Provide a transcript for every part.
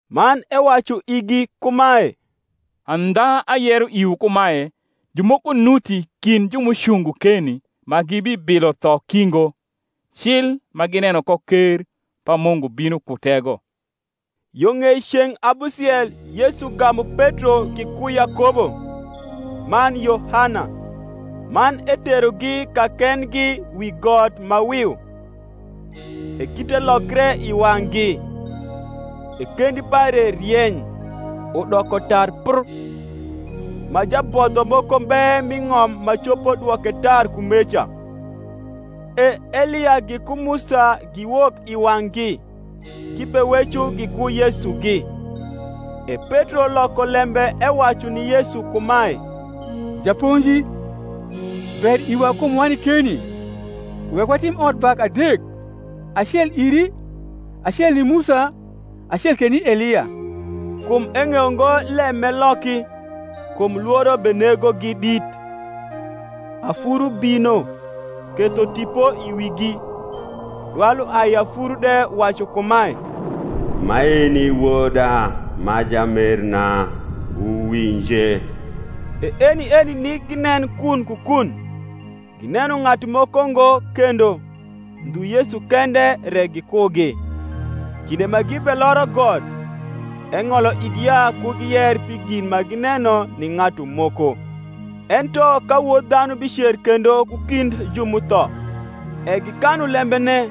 Man ewacu igi kumae, Audha ayero iwu kumae, Jumoko nuti kind ju m’ucungo keni, ma gibibilo tho ki ngo, cil ma gineno ko ker pa Mungu bino ku tego. Yo ng’ei ceng’ abusiel Yesu gamu Petro giku Yakobo, man Yohana, man eterogi kakendgi wi got ma wiu: e kite lokre i wang’gi; e kendi pare rieny, udoko tar pr, ma jabodho moko mbe m’i ng’om ma copo dwoke tar kumeca. E Elia giku Musa giwok i wang’gi: gibeweco giku Yesugi. E Petro loko lembe ewacu ni Yesu kumae, Japonji, ber iwa kum wani keni: wek watim odbak adek; acel iri, acel ni Musa, acel ke ni Elia. Kum eng’eyo ngo lem m’eloki, kum Iworo benegogi dit. Afuru bino ketho tipo i wigi: dwal uai i afuru de wacu kumae, Maeni Woda ma jamerna: wuwinje. E eni eni nik ginen kun ku kun, gineno ng’atu moko ngo kendo, ndhu Yesu kende re gikugi. Kinde ma gibeloro got, eng’olo igi ya ku giyer pi gin ma gineno ni ng’atu moko, ento ka Wod dhanu bicer kendo ku kind ju m’utho. E gikanu lembene,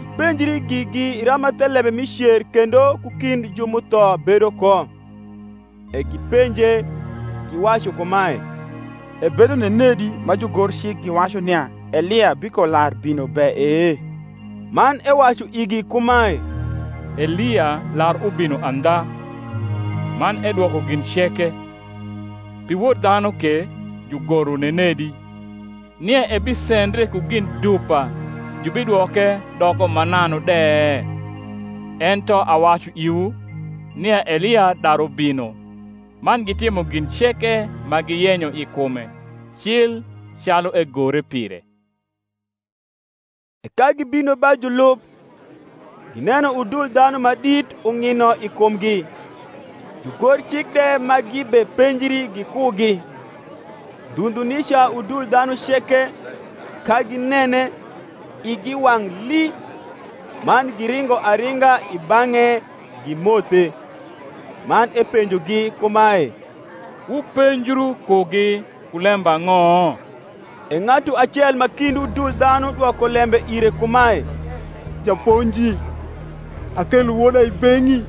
gipenjri gigi rama thelembe mi cer kendo ku kind ju m’utho bedo ko. E gipenje, giwacu kumae, Ebedo nenedi ma jugorcik giwacu nia Elia bikolar bino be e? Man ewacu igi kumae, Elia lar ubino andha, man edwoko gin ceke: pi Wod dhanu ke jugoro nenedi, nia ebisendre ku gin dupa jubidwoke doko mananu de? Ento awacu iwu, nia Elia daru bino, man gitimo gin ceke ma giyenyo i kume, cil calu egore pire. E ka gibino ba julub, gineno udul dhanu ma dit ung’ino i kumgi, jugorcik de ma gibepenjri gikugi. Ndhu ndhu nica udul dhanu ceke, ka ginene, igi wang’ lii, man giringo aringa i bang’e gimothe. Man epenjogi kumae, Wupenjru kugi ku lembang’o? E ng’atu acel ma kind udul dhanu dwoko lembe ire kumae, Japonji, akelo woda i beng’i,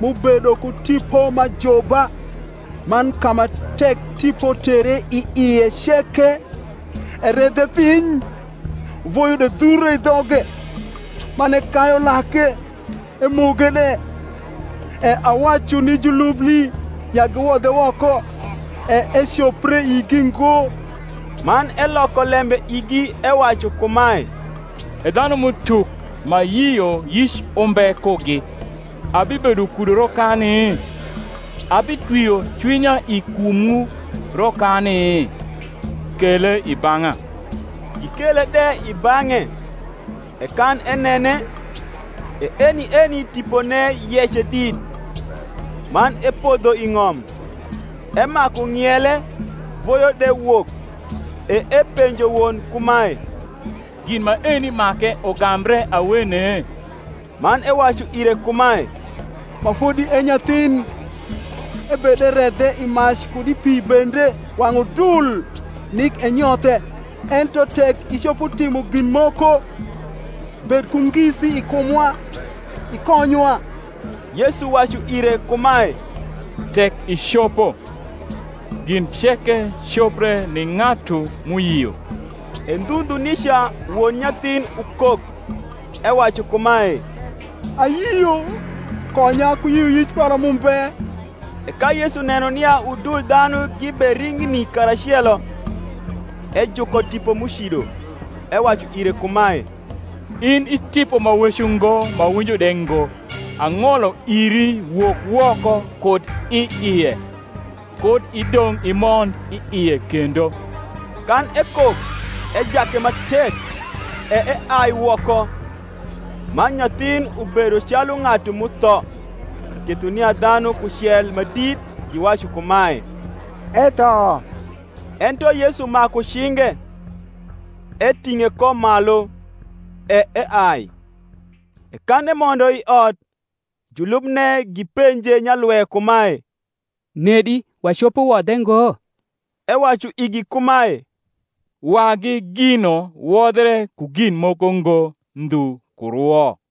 m’ubedo ku tipo m’ajuba; man ka ma tek tipo tere i ie ceke, eredhe piny: voyo de dhure i dhoge, man ekayu lake, emoge de: e awacu ni julubni ya giwodhe woko; e ecopre igi ngo. Man cloko lembe igi ewacu kumae, E dlianmrrutuk ma yioyic umbe kugi, abibedo kudu rokani? abitwio cwinya i kumwu rokani? kele i bang’a. Gikele de i bang’e: e kan enene, e eni eni tipone yece dit; man epodho i ng’om, emaku ng’iele voyo de wok. E epenjo won kumae, Gin maeni make ugambre awene? Man ewacu ire kumae, Ma fodi e nyathin. Ebederedhe i mac kud i pi bende wang’ udul, nik enyothe: ento tek icopo timo gin moko, bed ku ngisi i kumwa, ikonywa. Yesu wacu ire kumae, Tek icopo! Gin ceke copre ni ng’atu m’uyio. E ndhu ndhu nica won nyathin ukok, ewacu kumae, Ayio; konya ku yioyic para m’umbe. E ka Yesu neno nia udul dhanu gibering’ni karacelo, ejuko tipo m’ucido, ewacu ire kumae, In i tipo ma weco ngo ma winjo de ngo, ang’olo iri wok woko kud i ie, kud i dong’ imond i ie kendo. Kan ekok, ejake ma tek, e eai woko: man nyathin ubedo calu ng’atu m’utho; ketho nia dhanu kucel ma dit giwacu kumae, Etho. Ento Yesu maku cinge, eting’e ko malu; e eai. E kan emondo i ot, julubne gipenje nyalwe kumae, Nedi wacopo wodhe ngo? ewacu igi kumae, Wagi gino wodhre ku gin moko ngo, ndhu ku rwo.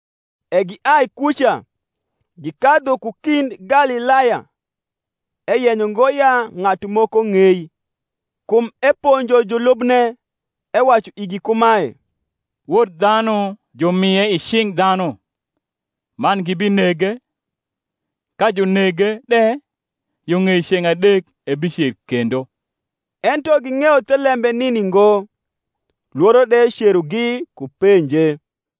E giai kuca, gikadhu ku kind Galilaya; eyenyo ngo ya ng’atu moko ng’ei. Kum eponjo julubne, ewacu igi kumae, Wod dhanu jumie i cing’ dhanu, man gibinege; ka junege de, yo ng’ei ceng’ adek ebicer kendo. Ento ging’eyo thelembe nini ngo, lworo de cerogi ku penje.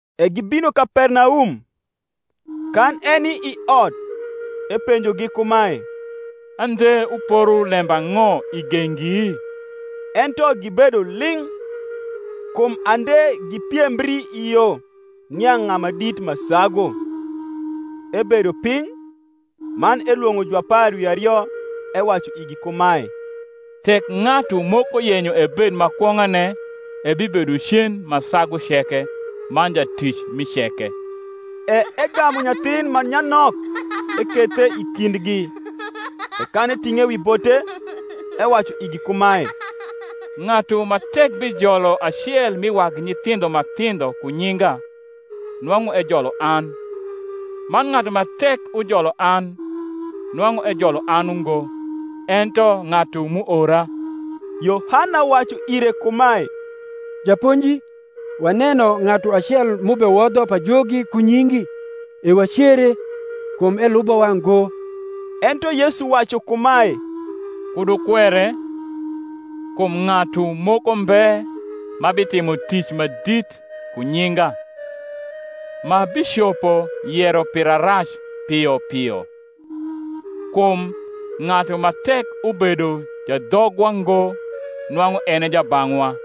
E gibino Kapernaum: kan eni i ot epenjogi kumae, Ande wuporo lembang’o i gengi? Ento gibedo ling’: kum ande gipiembri i yo, nia ng’a ma dit ma sagu. Ebedo piny, man elwong’o juapar wi ario; ewacu igi kumae, Tek ng’atu moko yenyo ebed ma kwong’ane, ebibedo cen ma sagu ceke, man jatic mi ceke. E egamu nyathin ma nyanok, ekethe i kindgi: e kan eting’e wi bote, ewacu igi kumae, Ng’atu ma tek bijolo acel mi wagi nyithindho ma thindho ku nyinga, nwang’u ejolo an; man ng’atu ma tek ujolo an, nwang’u ejolo an ungo, ento ng’atu m’uora. Yohana wacu ire kumae, Japonji, waneno ng’atu acel m’ubewodho pajogi ku nyingi; e wacere, kum elubowa ngo. Ento Yesu wacu kumae, Kud wukwere: kum ng’atu moko mbe ma bitimo tic ma dit ku nyinga, ma bicopo yero pira rac pio pio. Kum ng’atu ma tek ubedo jadhogwa ngo nwang’u en e jabang’wa.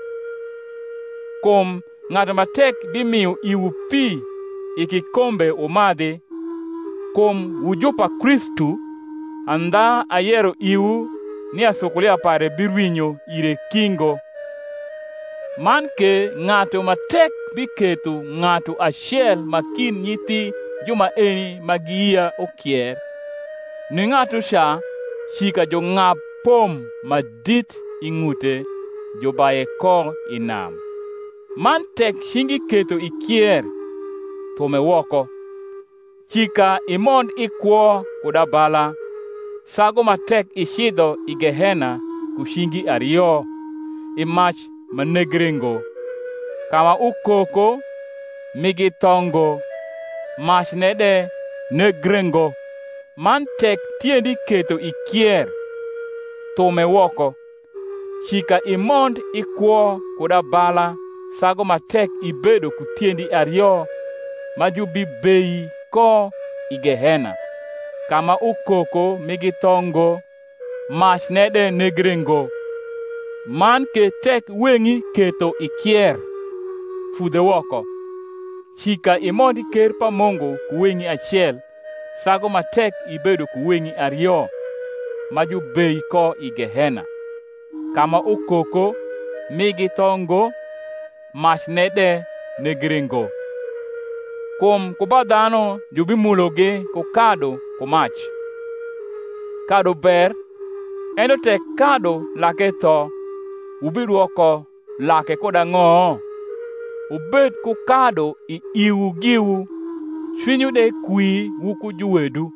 Kum ng’atu ma tek bimio iwu pi i kikombe wumadhi, kum wu ju pa Kristu, andha ayero iwu, nia sukulia pare birwinyo ire ki ngo. Man ke ng’atu ma tek biketho ng’atu acel ma kind nyithi ju maeni ma giyia ukier, ni ng’atuca cika jung’ab pom ma dit i ng’ute, jubaye ko i nam. Man tek cingi ketho ikier, thume woko: cika imond i kwo kud abala, sagu ma tek icidho i gehena ku cingi ario, i mac ma negre ngo, ka ma ukoko migi tho ngo, macne de negre ngo. Man tek tiendi ketho ikier, thume woko: cika imond i kwo kud abala sagu ma tek ibedo ku tiendi ario ma jubibei ko i gehena, ka ma ukoko migi tho ngo, macne de negre ngo. Man ke tek weng’i ketho ikier, fudhe woko: cika imond i ker pa Mungu ku weng’i acel sagu ma tek ibedo ku weng’i ario ma jubei ko i gehena, ka ma ukoko migi tho ngo, macne de negre ngo. Kum ku ba dhanu jubimulogi ku kadu ku mac. Kadu ber: ento tek kadu lake tho, wubidwoko lake kud ang’o? Wubed ku kadu i iwu giwu, cwinywu de kwi wuku juwedu.